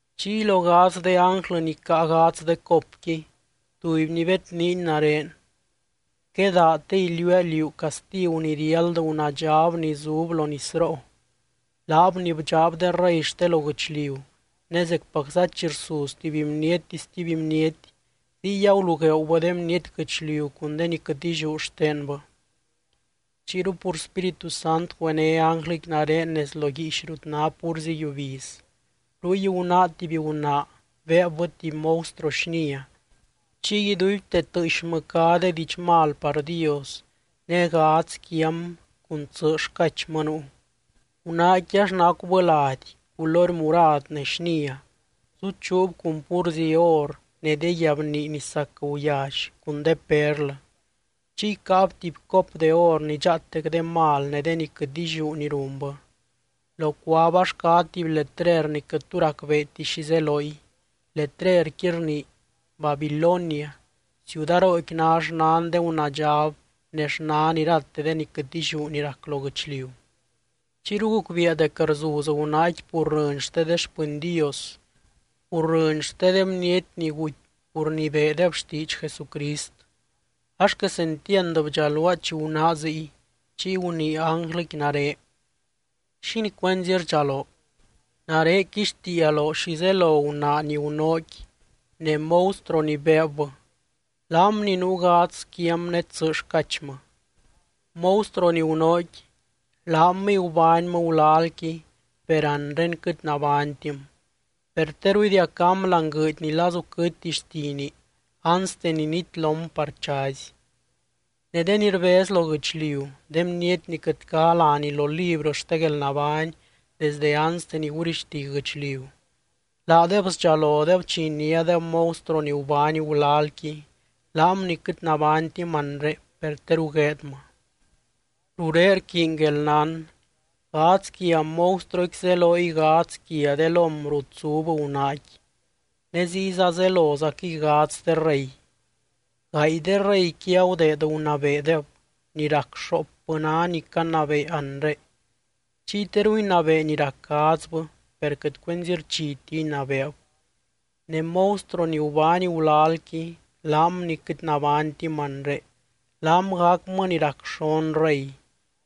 Chiy lo gadz de ánglɨ ni caa gadz de copqui, tubyny bedniiny nare: —Quedaa te iliuua liú castigu ni riáld gunaadxab ni zub lo nisroo, laab ni bdxaab de rey xte lo guɨchliu, ne zecpacza chi rsuz tuby bniety stuby bniety, ziy agulugueeubɨ de bniety guɨchliu cun de ni quɨt illiú xtenbɨ. Chiyru pur spírit güené ánglɨqui nare nez lo guiix rut ná púrzi yiubiz. Ruy gunáa tuby gunaa beebbɨ tuby monstruo xnia, chiy iduibte tɨɨxmɨ cá de diidx mal par Dios, ne gadz quiam cun tsɨ xcachmɨ nuu. Gunaaqui ax nacubɨ lady culory murad ne xnia, zuchuub cun púrzi or ne de guiabnii ni sac guyally cun de perlɨ. Chiy caab tuby cop de or ni dxaatec de mal ne de ni quɨt illiú ni runbɨ. Locuab ax cá tuby letrer ni quɨt tu racbeeti xi zeloy, letrerqui rnii: BABILONIA, CIUDAROOQUI NÁ XNAN DE GUNAADXAB NE XNAN IRATE DE NI QUƗT ILLIÚ NI RAC LO GUƗCHLIU. Chiyru gucbiia dec rzuz gunaaqui pur rɨny xte de xpɨny Dios, pur rɨny xte de bniety ni guty pur ni beedeb xtiidx Jesucrist. Ax quesentiand bdxaluaa chi gunáa ziy. Chiy gunii ánglɨqui nare: —¿Xínii cuenzi rdxaloo? Nare quixtiia loo xi zelo gunaa ni gunóoqui ne monstruo ni beebbɨ, laam ni nuu gadz quiam ne tsɨ xcachmɨ. Monstruo ni gunóoqui, laamɨy gubánymɨ gulalqui, per anre quɨt nabánytim. Per teru idiacám láani guɨɨdy ni lazu quɨtti xtini anste ni nitlom par chazy. Ne de ni rbez lo guɨchliu, de bniety ni quɨt cá láni lo librɨ xte guelnabány desde anste ni gurixti guɨchliu, laadeb sdxalodeb chi iniádeb monstruo ni gubány gulalqui, laam ni quɨt nabánytim anre, per teru gueedmɨ. ’Rurén rquiiny guelnán. Gadz quia monstruoqui zeloy gadz quia de lóm rut zub gunaaqui ne ziyza zelozaquɨy gadz de rey. Gaay de reyqui agudeed gunabeedeb, ni rac xoopbɨ ná ni canabee anre. Chiy teru inabee ni rac gadzbɨ, per quɨt cuenzi xchiti inabeeb. Ne monstruo ni gubány gulalqui, laam ni quɨt nabánytim anre, laam gacmɨ ni rac xon rey,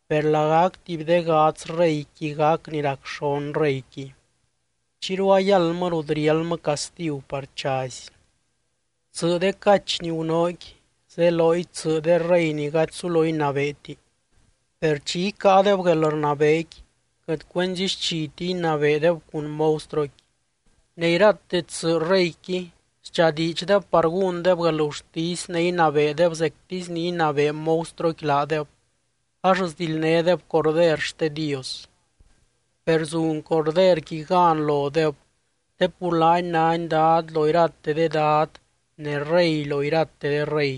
per lagac tuby de gadz reyqui gac ni rac xon reyqui. Chiyru ayáldmɨ rut riáldmɨ castigu par chazy. ’Tsɨ de cach ni gunóoqui zeloy tsɨ de rey ni gady sulo inabeeti. Per chi icáadeb guelrnabeequi, quɨt cuenzi xchiti inabeedeb cun monstruoqui. Ne irate tsɨ reyqui sdxadiidxdeb par gúndeb guelgurtisy ne inabeedeb zectisy ni inabee monstruoqui laadeb, ax sdildnédeb Corder xte Dios. Per zun Corderqui gan lodeb te pur laany nány Dad lo irate de dad ne Rey lo irate de rey.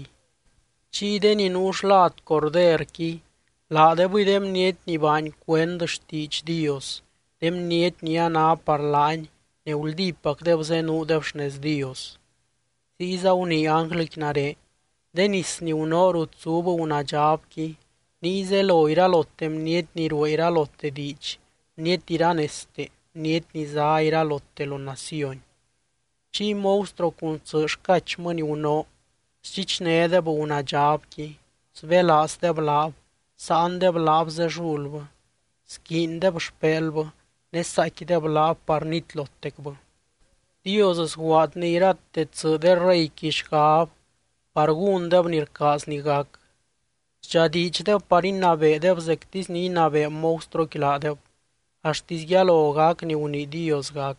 Chiy de ni nuu xlad Corderqui, laadebɨy de bniety ni baany cuend xtiidx Dios, de bniety ni a ná par laany ne guldípacdeb zenuudeb xnez Dios. Ziyza gunii ánglɨqui nare: —De nis ni gunóo rut zub gunaadxabqui niy zelo iralote bniety ni ruee iralote diidx, bniety iranezte, bniety ni zá iralote lo naciony. Chiy monstruo cun tsɨ xcachmɨ ni gunóo, sdxichnédeb gunaadxabqui, sbélaazdeb laab, sáandeb laab zellulbɨ, squiindeb xpelbɨ ne saaicquideb laab par nitlotecbɨ. Dios sguaadny irate tsɨ de reyqui xgab par gúndeb ni rcaazny gac. Sdxadiidxdeb par inabeedeb zectisy ni inabee monstruoqui laadeb, axtisy yalo gac ni gunii Dios gac.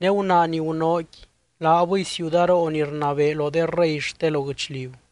Ne gunaa ni gunóoqui laabɨy ciudaroo ni rnabee lo de rey xte lo guɨchliu.